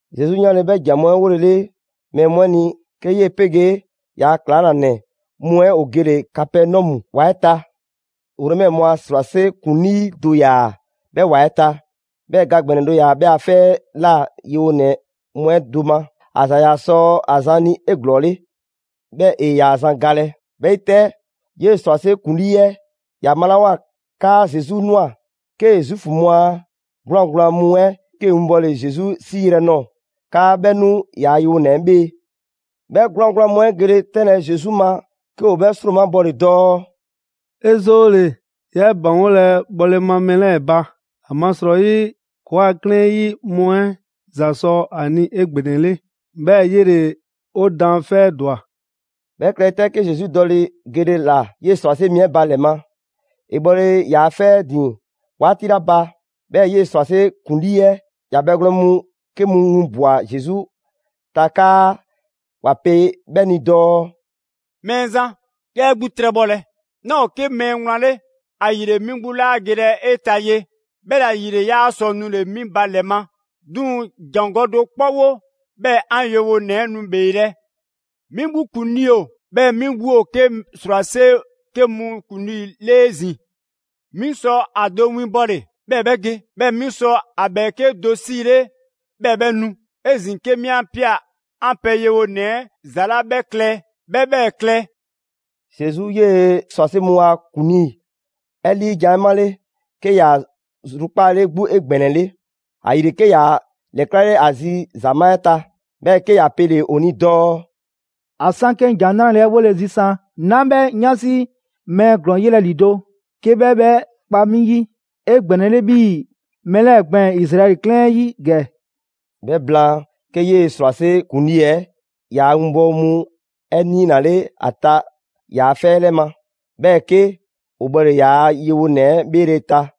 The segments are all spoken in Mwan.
Zesu 'yanle‑ 'bhɛ ‑jan mu 'ɛ 'wolele mɛɛ mu 'ɛ ni, 'ke 'yee‑ 'pegee ‑yaa' ‑klaŋlanɛ mu 'ɛ ‑o gele‑ Kapɛnɔmu ‑wa 'ɛ ta. Romɛ mu a ‑srwase' ‑kuŋlii do ‑yaa 'bhɛ ‑wa 'ɛ ta, 'bhɛɛ‑ ga ‑gbɛnɛ do ‑yaa 'bhɛ a 'fɛ 'ɛ ꞊la yewonɛ mu 'ɛ do ma. ‑A ‑za ‑yaa sɔ ‑a zan ni 'eglɔɔle. 'Bhɛ ‑e 'yaa‑ zan galɛ, 'Bhɛ 'yi 'tɛ, 'yee ‑srwase' ‑kuŋlii 'ɛ ‑ya 'malawoa 'kaa Zesu ꞊nwa, 'kee‑ Zuufu mu a 'gwlaan‑ gblaan mu 'ɛ 'ke 'winbɔle Zesu 'siiyrɛ‑ nɔɔ‑ 'kaa 'bhɛ 'nu ‑yaa' yewonɛ 'ɛ 'bhee‑. 'Bhɛ 'gwlaan‑ gblaan mu 'ɛ gele 'tɛnlɛ‑ Zesu ma, 'ke ‑o 'bhɛ ‑sromabɔle dɔɔ: «'E 'zoole‑, 'yaa 'e ‑baŋgolɛ bhɔle ma mɛɛ 'lɛɛ‑ ba. ‑Amasrɔyi, ‑kɔɔa' 'klɛɛn 'ɛ 'yi mu 'ɛ ‑za sɔ a ni 'egbɛnɛle. 'Bhɛɛ‑ 'yele‑ 'o daanfɛ' 'ɛ ‑dwa.» 'Bhɛ klɛle 'tɛ, 'ke Zesu dɔle‑ gele ‑la 'yee‑ ‑srwase' mi 'ɛ ba ‑lɛ ma. ‑E bhɔle ‑yaa' 'fɛ 'ɛ ‑din 'waati 'la ba, 'bhɛɛ‑ 'yee‑ ‑srwase' ‑kuŋlii 'ɛ ‑ya bhɛgwlɛn mu 'ke mu winbwa‑ Zesu ta 'kaa ‑wa pe 'bhɛ ni dɔɔ: «Mɛɛzan, 'yaa 'e 'gbu 'trɛbhɔlɛ. 'Naa ‑o 'ke mɛɛ wlan 'le, ‑ayile 'mi 'gbu 'laa gelɛ 'e ta ye; 'bhɛla‑ ‑yile 'yaa sɔ nule‑ 'mi ba ‑lɛ ma. 'Duŋ‑ ‑jangɔ' do 'kpɔ 'wo, 'bhɛɛ‑ 'an yewonɛ 'ɛ nu ‑bheelɛ'. 'Mi 'gbu ‑kuŋlii ‑o, 'bhɛɛ‑ 'mi 'gbu ‑o 'ke ‑srwase' 'ke mu ‑kuŋlii 'le 'ezin‑. 'Mi sɔ ‑a do winbɔle, 'bhɛɛ‑ 'bhɛ ge; 'bhɛɛ‑ 'mi sɔ ‑a ‑bhɛɛke' do 'siile, 'bhɛɛ‑ 'bhɛ nu. 'Ezin‑ 'ke 'mi 'a ꞊pia 'an pɛ yewonɛ 'ɛ ‑za 'la 'bhɛ klɛ, 'bhɛ 'bhɛɛ‑ klɛ.» Zesu 'yee‑ ‑srwase' mu a ‑kuŋlii 'ɛ 'liijan‑ 'ɛ 'male‑, 'ke ‑a zrukpaale 'gbu 'egbɛnɛle. ‑Ayile 'ke ‑ya ‑lɛklale ‑a zi ‑zamaa' 'ɛ ta, 'bhɛɛ‑ 'ke ‑ya pele‑ ‑o ni dɔɔ: «‑A 'san 'ke 'ŋ ‑Jan 'nrale‑ 'ɛ 'wole‑ zisan, 'naa 'bhɛ 'yansi mɛɛ ‑glɔɔn yelɛ ‑lido' 'ke 'bhɛ 'bhɛ kpa 'mi 'yi 'egbɛnɛle 'bhii‑ mɛɛ 'lɛɛ‑ gbɛɛn‑ Izraɛli 'klɛɛn 'ɛ 'yi ‑gɛ.» 'Bhɛ blaan, 'ke 'yee‑ ‑srwase' ‑kuŋlii 'ɛ yaa winbɔwo mu 'ɛ 'niinale ‑a ta ‑yaa' 'fɛ 'ɛ 'lɛ ma. 'Bhɛɛ‑ 'ke ‑o bhɔle ‑yaa' yewonɛ 'ɛ 'bheele‑ ta.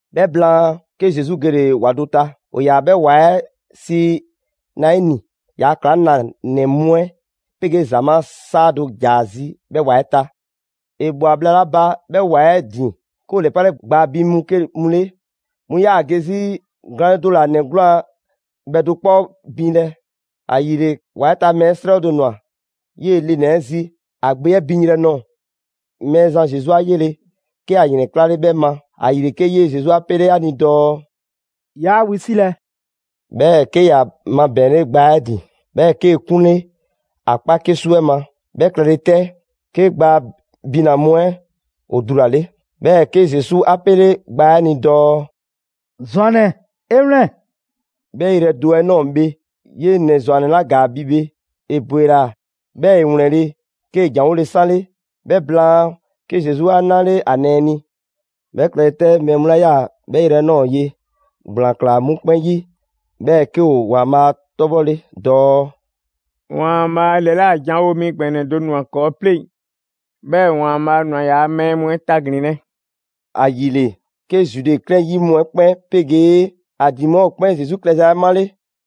'Bhɛ blaan, 'ke Zesu gele‑ ‑wa do ta, ‑o ‑yaa 'bhɛ ‑wa 'ɛ sii Naini. ‑Yaa' ‑klaŋlanɛ mu 'ɛ 'pegee ‑zamaa' 'saa do ‑ja ‑a zi 'bhɛ ‑wa 'ɛ ta. ‑E ꞊bhwa bhla 'la ba 'bhɛ ‑wa 'ɛ ‑din, 'ke ‑o ‑lɛpale gbaa bin mu 'ke mu 'le, 'mu 'yaa‑ ge 'zi glaanle do ‑la ‑nɛ 'gwlaan‑ bhɛdo 'kpɔ 'ɛ binlɛ. ‑Ayile, ‑wa 'ɛ ta mɛɛ 'srɛ do ꞊nwa 'yee‑ le ‑nɛ 'ɛ zi ‑a gbe 'ɛ binyrɛ nɔɔ‑. Mɛɛzan Zesu 'a yele, 'ke ‑a ‑yrɛnklale 'bhɛ ma, ‑ayile 'ke 'yee‑ Zesu 'a pele‑ ‑a ni dɔɔ: «'Yaa wisilɛ!» 'Bhɛɛ‑ 'ke ‑ya mabɛɛnle gbaa 'ɛ ‑din, 'bhɛɛ‑ 'kee‑ 'kunle ‑a 'kpa 'kesu 'ɛ ma. 'Bhɛ klɛle 'tɛ, 'ke gbaa bina‑ mu 'ɛ ‑o dulale. 'Bhɛɛ‑ 'ke Zesu 'a 'pele gbaa 'ɛ 'a ni dɔɔ: «‑Zwannɛ, 'e 'wlɛn‑!» 'Bhɛ yrɛ do 'ɛ ꞊nɔɔ bhe, 'yee‑ ‑nɛ ‑zwannɛ 'la ‑gaa bi bhe, ‑e ‑bwela, 'bhɛɛ‑ ‑e ‑wlɛnle', 'kee‑ ‑janwole 'sanle. 'Bhɛ blaan, 'ke Zesu 'a 'nale ‑a nɛɛ ni. 'Bhɛ klɛle 'tɛ, mɛɛ mu 'la 'yaa‑ 'bhɛ yrɛ 'ɛ ꞊nɔɔ ye, ‑gblaan ꞊klaa 'mu 'kpɛn 'yi, 'bhɛɛ‑ 'ke ‑o ‑Waanbhaa' 'tɔbhɔle dɔɔ: «‑Waanbhaa' ‑lɛla' janwo mi ‑gbɛnɛ do ‑nwa ‑kɔɔ' 'pleŋ‑, 'bhɛɛ‑ ‑Waanbhaa' ‑nwa ‑yaa' mɛɛ mu 'ɛ taglinlɛ!» ‑Ayile 'ke Zude 'klɛɛn 'ɛ 'yi mu 'ɛ kpɛn 'pegee ‑a ‑din mu 'ɛ ‑o 'kpɛn Zesu klɛza 'ɛ 'male.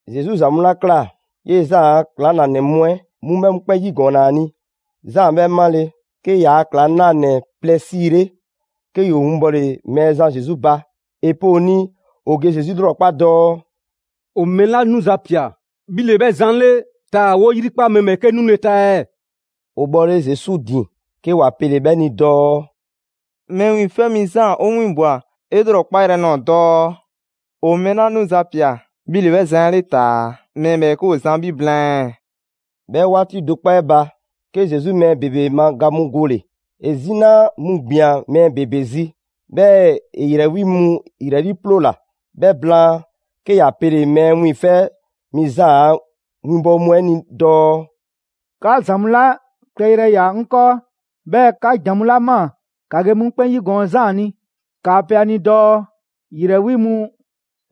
Zesu ‑za mu 'la ꞊kla, 'yee‑ Zaan a ‑klaŋlanɛ mu 'ɛ 'mu 'bhɛ mu 'kpɛn 'yigɔɔnna ‑a ni. Zaan 'bhɛ 'male‑, 'kee‑ ‑yaa' ‑klaŋlanɛ plɛ 'siile, 'ke ‑yoo winbɔle Mɛɛzan Zesu ba. ‑E pe ‑o ni ‑o ge Zesu 'lrɔkpa dɔɔ: «‑O mɛɛ 'la 'nuza‑ ꞊pia, 'bhi ‑le 'bhɛ zan 'ɛ 'le, taa‑ 'woo 'yrikpa mɛɛ ‑bhɛɛke' 'nule‑ ta ɛɛ?» ‑O bhɔle Zesu ‑din, 'ke ‑wa pele‑ 'bhɛ ni dɔɔ: «Mɛɛ Wiiŋfɛ' Mi Zaan 'o 'winbwa‑ 'e 'lrɔkpa yrɛ nɔɔ‑ dɔɔ: ‑O mɛɛ 'la 'nuza‑ ꞊pia 'bhi ‑le 'bhɛ zan 'ɛ 'le taa‑ mɛɛ ‑bhɛɛke' ‑o zan 'bhi blaan ɛɛ?» 'Bhɛ 'waati do 'kpɔ 'ɛ ba, 'ke Zesu mɛɛ ‑bebe ma ga mu gole‑, ‑e 'zina mu ‑gbian mɛɛ ‑bebe zi, 'bhɛɛ‑ ‑e ‑yrɛ 'wi mu ‑yrɛ 'liiploola. 'Bhɛ blaan, 'ke ‑ya pele‑ Mɛɛ Wiiŋfɛ' Mi Zaan a winbɔwo mu 'ɛ ni dɔɔ: «'Ka ‑za mu 'la klɛyrɛ ‑ya 'ŋ 'kɔɔ, 'bhɛɛ‑ 'ka ‑jan mu 'la ꞊maa, ‑ka ge 'mu 'kpɛn 'yigɔɔn‑ Zaan ni. ‑Kaa pe ‑a ni dɔɔ: ‑yrɛ 'wi mu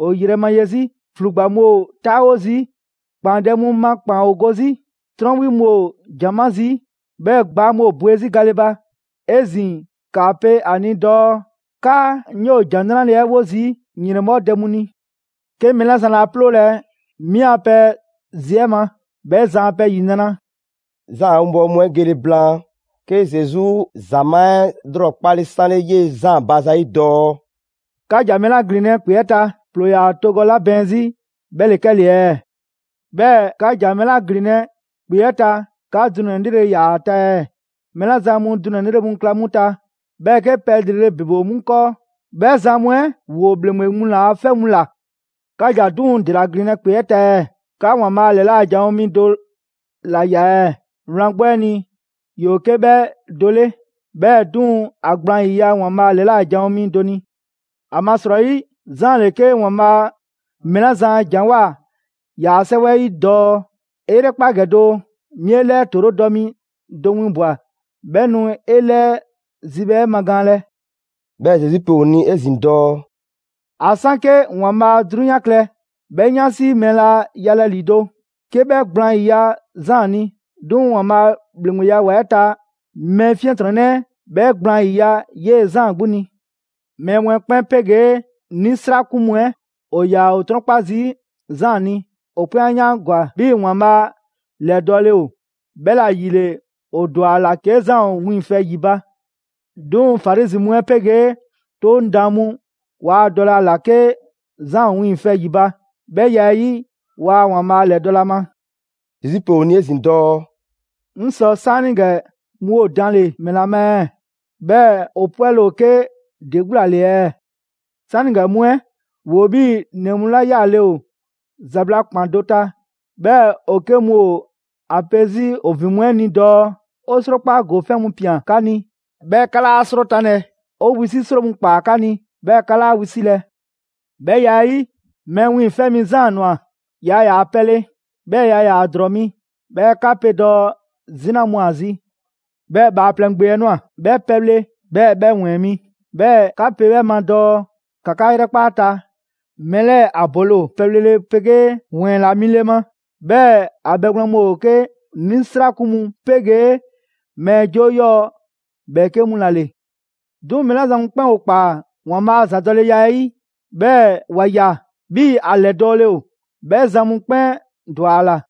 ‑o yrɛ ma ye 'zi, ‑flugba mu ‑o 'taawo zii', ‑kpaandɛ' mu ma ‑kpaan ‑o go 'zi, 'trɔn 'wi mu ‑o ‑jan 'ma zii', 'bhɛɛ‑ gbaa mu ‑o bwe 'zi gale ba. 'Ezin‑ ‑kaa pe ‑a ni dɔɔ 'kaa 'ŋ 'yoo‑ ‑Jan 'Nrale 'ɛ 'wo zii' ‑yrɛnbhɔ' dɛ mu ni. 'Ke mɛɛ 'la zan laa 'ploolɛ‑ 'mi a pɛ zi 'ɛ ma, 'bhɛ zan a pɛ ‑yinra'.» Zaan a winbɔwo mu 'ɛ gele blaan, 'ke Zesu ‑zamaa' 'ɛ 'lrɔkpale 'sanle 'yee‑ Zaan ba zayi' dɔɔ: «'Ka ‑ja ‑mɛla ‑glinlɛ' ‑kpe 'ɛ ta. ‑Ploo ‑yaa togɔ 'la bɛɛn 'zi 'bhɛ ‑le 'kɛle‑ ɛɛ? 'Bhɛɛ‑ 'ka ‑ja mɛɛ 'la ‑glinlɛ' ‑kpe 'ɛ ta, 'ka dunɛ‑ 'lrele‑ ꞊ya ‑a ta ɛɛ? Mɛɛ 'la zan mu dunɛ‑ 'lrele‑ mu kla 'mu ta, 'bhɛɛ‑ 'ke pɛ ‑lrele' ‑bebe ‑o 'mu ‑kɔɔ, 'bhɛ zan mu 'ɛ ‑woo ‑bhleŋgbe mu ‑la 'fɛ mu ꞊la. 'Ka ‑ja 'duŋ‑ ‑dela ‑glinlɛ' ‑kpe 'ɛ ta ɛɛ? 'Ka ‑Waanbhaa' ‑lɛla' janwo mi do ‑la ꞊ya ɛɛ? Wlan 'gbu 'ɛ ni, ‑yoo 'ke 'bhɛ do 'le, 'bhɛɛ‑ 'duŋ‑ ‑a gblaan ‑yiya' ‑Waanbhaa' ‑lɛla' janwo mi do ni. ‑Amasrɔyi Zaan ‑le 'ke ‑Waanbhaa' mɛɛ 'la zan a ‑janwoa ‑yaa' 'Sɛwɛ 'ɛ 'yi dɔɔ: ‹'E 'yrɛkpa ‑gɛ doo, 'mi 'e 'lɛɛ ‑toorodɔ mi do winbwa‑. 'Bhɛ nu 'e 'lɛɛ zibhɛ 'ɛ magaanlɛ.›» 'Bhɛɛ‑ Zesu pe ‑o 'ezin‑ dɔɔ: «‑A 'san 'ke ‑Waanbhaa' 'drunyan klɛ, 'bhɛ 'yansi mɛɛ laa yalɛ ‑lido', 'ke 'bhɛ gblaan ‑yiya' Zaan ni. 'Duŋ‑ ‑Waanbhaa' a ‑bhleŋgbeya ‑wa 'ɛ ta mɛɛ 'fiɛntrɔnnɛ 'ɛ bhɛ gblaan 'yiya‑ 'yee‑ Zaan 'gbu ni. Mɛɛ mu 'ɛ 'kpɛn 'pegee 'nisrakun mu 'ɛ ‑o ‑yaa ‑o 'trɔn 'kpa zii' Zaan ni. ‑O 'kpɛn 'a 'yaangwa‑ 'bhii‑ ‑Waanbhaa' ‑lɛdɔɔle ‑o, 'bhɛla‑ ‑yile ‑o ‑dwa ‑a ‑la 'ke Zaan ‑o wiiŋfɛ ‑yi ba ba. 'Duŋ‑ Farizi mu 'ɛ 'pegee 'Toŋ daan mu waa dɔlɛ ‑a ‑la 'ke Zaan ‑o wiiŋfɛ ‑yi ba, 'bhɛ ya 'ɛ 'yi, waa ‑Waanbhaa' ‑lɛdɔlɛ ‑a ma.» Zesu pe ‑o ni 'ezin‑ dɔɔ: «'Ŋ sɔ 'saanigɛ mu ‑o danle‑ ‑mɛla ma ɛɛ? 'Bhɛɛ‑ ‑o 'pwɛle‑ ‑o 'ke ‑de 'gbu ‑la ‑le ɛɛ? 'Saanigɛ mu 'ɛ ‑woo 'bhii‑ ‑nɛ mu 'la 'yaale‑ ‑o ‑zabla' ‑kpan do ta, 'bhɛɛ‑ ‑o 'ke mu ‑o ‑a 'pe 'zi ‑o ‑vin mu 'ɛ ni dɔɔ: ‹'O 'srokpa ‑gofɛn' mu ꞊pian 'ka ni, 'bhɛɛ‑ 'ka 'laa 'srotanlɛ. 'O wisi' 'sro mu ‑kpaa 'ka ni, 'bhɛɛ‑ 'ka 'laa wisilɛ!› 'Bhɛ ya 'ɛ 'yi, Mɛɛ Wiiŋfɛ' Mi Zaan ꞊nwa, yaa ‑yaa pɛle, 'bhɛɛ‑ yaa ‑yaa ‑drɔɔ mi, 'bhɛɛ‑ 'ka pe dɔɔ 'zina mu ‑o ‑a zi. 'Bhɛɛ‑ Bhaaplɛŋ Gbe 'ɛ ꞊nwa, 'bhɛ pɛbhle, 'bhɛɛ‑ 'bhɛ ‑wɛɛn mi. 'Bhɛɛ‑ 'ka pe 'bhɛ ma dɔɔ: ‑ka 'ka 'yrɛkpa 'a ta, mɛɛ 'lɛɛ‑ ‑a bole ‑o pɛbhlele 'pegee ‑wɛɛn ‑la mile ma. 'Bhɛɛ‑ ‑a bhɛgwlɛn mu ‑o 'ke 'nisrakun mu 'pegee mɛɛ 'joo 'yɔɔ‑ ‑bhɛɛke' mu ‑la ‑le! 'Duŋ‑ mɛɛ 'la zan mu 'kpɛn ‑o ‑kpaa ‑Waanbhaa' a ‑zadɔleya 'ɛ 'yi, 'bhɛɛ‑ ‑wa ꞊ya 'bhii‑ ‑a ‑lɛdɔɔle ‑o, 'bhɛ zan mu 'kpɛn ‑dwa ‑a ‑la.»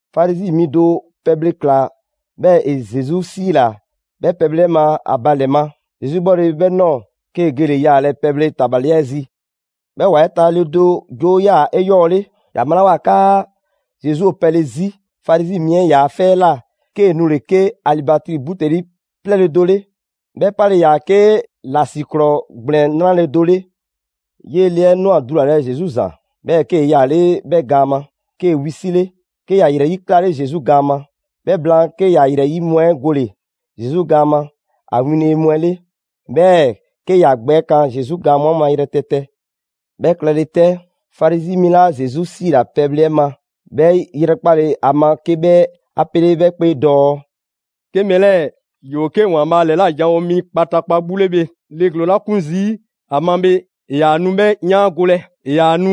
Farizi mi do pɛbhle ꞊kla, 'bhɛɛ‑ ‑e Zesu 'siila‑ 'bhɛ pɛbhle 'ɛ ma ‑a ba ‑lɛ ma. Zesu 'bhɔle‑ 'bhɛ ꞊nɔɔ, 'kee‑ gele‑ yaalɛ pɛbhle tabali 'ɛ zi. 'Bhɛ ‑wa 'ɛ ta le do 'joo 'yaa‑ 'eyɔɔle. ‑Ya 'malawoa 'kaa Zesu ‑o pɛle 'zi Farizi mi 'ɛ ‑yaa' 'fɛ 'ɛ ꞊la, 'kee‑ nule‑ 'ke alibatri buteli 'plɛɛle‑ do 'le, 'bhɛ 'pale‑ ‑yaa 'ke ‑lasiklɔɔ ‑gblɛn 'nrale‑ do 'le. 'Yee‑ le 'ɛ ꞊nwa dulalɛ Zesu ‑zan, 'bhɛɛ‑ 'kee‑ 'yaale 'bhɛ gaan ma. 'Kee‑ wisile 'ke ‑ya ‑yrɛyi' 'klale Zesu gaan ma. 'Bhɛ blaan 'ke ‑ya ‑yrɛyi' mu 'ɛ gole‑ Zesu gaan ma ‑a winle mu 'ɛ 'le, 'bhɛɛ‑ 'ke ‑ya gbɛ kan Zesu gaan mu 'ɛ ma yrɛtɛtɛ. 'Bhɛ klɛle 'tɛ, Farizi mi 'la Zesu 'siila‑ pɛle 'ɛ ma, 'bhɛ 'yrɛkpale ‑a ma, 'ke 'bhɛ 'a pele‑ 'bhɛ 'kpee dɔɔ: «'Ke mɛɛ 'lɛɛ‑ ‑yoo 'ke ‑Waanbhaa' ‑lɛla' janwo mi kpataakpa 'gbu 'le bhe, le ‑glɔɔn 'la 'kun zii' ‑a ma bhe, ‑e ‑yaa nu 'bhɛ 'yaangolɛ. ‑E ‑yaa nu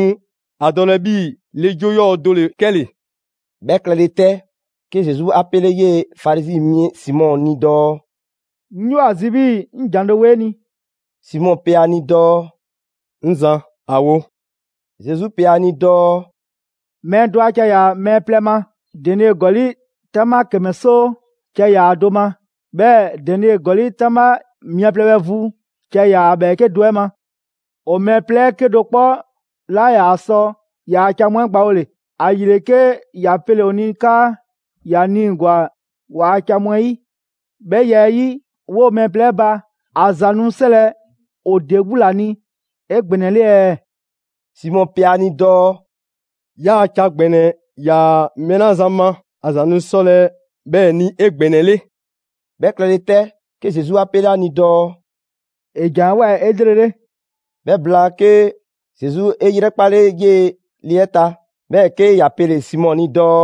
‑a dɔlɛ 'bhii‑ le 'joo 'yɔɔ‑ do ‑le 'kɛle‑.» 'Bhɛ klɛle 'tɛ, 'ke Zesu 'a 'pele 'yee‑ Farizi mi Simɔ ni dɔɔ: «'Ŋ 'yoo‑ ‑a zi 'bhii‑ 'ŋ ‑jan do wo 'e ni.» Simɔ pe ‑a ni dɔɔ: «'Ŋ Zan, ‑a wo!» Zesu pe ‑a ni dɔɔ: «Mɛɛ do ‑a ca ‑yaa mɛɛ plɛ ma. Denie ‑gɔli' 'taŋbha ‑kɛmɛ 'soo ca ‑yaa ‑a do ma, 'bhɛɛ‑ denie ‑gɔli' 'taŋbha mia plɛ bhɛ vu ca ‑yaa ‑a ‑bhɛɛke' do 'ɛ ma. ‑O mɛɛ plɛ 'ɛ 'kedo‑ 'kpɔ 'laa ‑yaa sɔ ‑yaa ca mu 'ɛ gbawole. ‑Ayile 'ke ‑ya pele‑ ‑o ni 'kaa ‑ya niigwa‑ ‑waa' ca mu 'ɛ 'yi. 'Bhɛ ya 'ɛ 'yi, 'woo‑ mɛɛ plɛ 'ɛ ba ‑a ‑za nu 'sɔlɛ‑ ‑o ‑de 'gbu ‑la ni 'egbɛnɛle ɛɛ?» Simɔ pe ‑a ni dɔɔ: «‑Yaa' ca ‑gbɛnɛ ‑yaa mɛɛ 'la zan ma ‑a ‑za nu 'sɔlɛ‑ 'bhɛɛ‑ ni 'egbɛnɛle.» 'Bhɛ klɛle 'tɛ, 'ke Zesu 'a 'pele ‑a ni dɔɔ: «'E ‑jan 'ɛ ꞊woa 'elrele.» 'Bhɛ blaan 'ke, Zesu 'e 'yrɛkpale 'yee‑ le 'ɛ ta, 'bhɛɛ‑ 'ke ‑ya pele‑ Simɔ ni dɔɔ: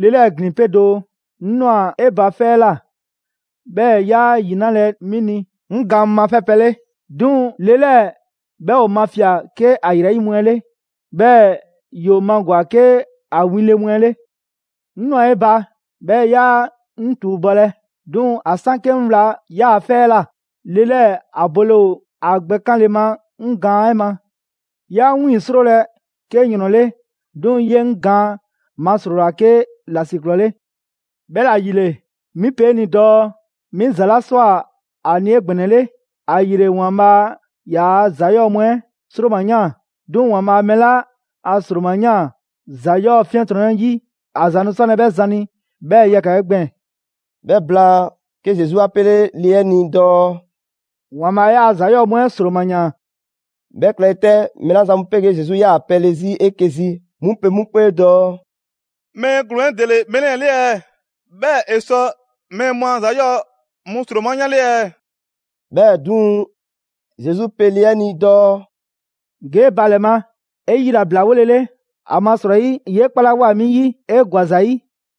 «Le 'lɛɛ‑ ‑glin 'pe doo. 'Ŋ ꞊nwa 'e ba 'fɛ 'ɛ ꞊la, 'bhɛɛ‑ 'yaa ‑yi 'nalɛ‑ 'mi ni 'ŋ gaan mu mafɛ' pɛ 'le. 'Duŋ‑ le 'lɛɛ‑ 'bhɛ ‑o mafia‑ 'ke ‑a ‑yrɛyi' mu 'ɛ 'le, 'bhɛɛ‑ ‑yoo magwa‑ 'ke ‑a winle mu 'ɛ 'le. 'Ŋ ꞊nwa 'e ba, 'bhɛɛ‑ 'yaa 'ŋ ‑tuubɔlɛ. 'Duŋ‑ ‑a 'san 'ke 'ŋ wla 'yaa‑ 'fɛ 'ɛ ꞊la, le 'lɛɛ‑ ‑a bole ‑o ‑a gbɛ 'kanle‑ ma 'ŋ gaan 'ɛ ma. 'Yaa 'ŋ 'wiiŋ‑ 'srolɛ‑ 'ke ‑yrɔn 'le, 'duŋ‑ 'yee‑ 'ŋ gaan masrola 'ke ‑lasiklɔɔ 'le. 'Bhɛla‑ ‑yile, 'mi pe 'e ni dɔɔ 'mi ‑za 'la ꞊swa ‑a ni 'egbɛnɛle, ‑ayile ‑Waanbhaa' ‑yaa ‑za 'yɔɔ‑ mu 'ɛ 'sroma‑ ‑yaan. 'Duŋ‑ ‑Waanbhaa' mɛɛ 'la a ‑sroma yan ‑za 'yɔɔ‑ 'fiɛntrɔnnɛ 'yi, ‑a ‑za nu 'sɔlɛ‑ 'bhɛ zan ni 'bhɛɛ‑ yɛkɛ‑ gbɛɛn‑.» 'Bhɛ blaan, 'ke Zesu 'a 'pele le 'ɛ ni dɔɔ: «‑Waanbhaa' 'yaa‑ ‑za 'yɔɔ‑ mu 'ɛ ‑sroma ‑yaan.» 'Bhɛ klɛle 'tɛ, mɛɛ 'la zan mu 'pegee Zesu 'yaa‑ pɛle 'zi 'eke‑ zi 'mu pe 'mu 'kpee dɔɔ: «Mɛɛ ‑glɔɔn 'ɛ ‑dele mɛɛ 'lɛɛ‑ 'le, 'bhɛɛ‑ ‑e sɔ mɛɛ mu a ‑za 'yɔɔ‑ mu ‑sroma 'yanle ɛɛ?» 'Bhɛɛ‑ 'duŋ‑, Zesu 'pe le 'ɛ ni dɔɔ: «Ge 'e ba ‑lɛ ma 'e yilablawolele, ‑amasrɔyi 'yee 'kpalawoa 'mi 'yi 'e ‑gwa ‑za 'yi.»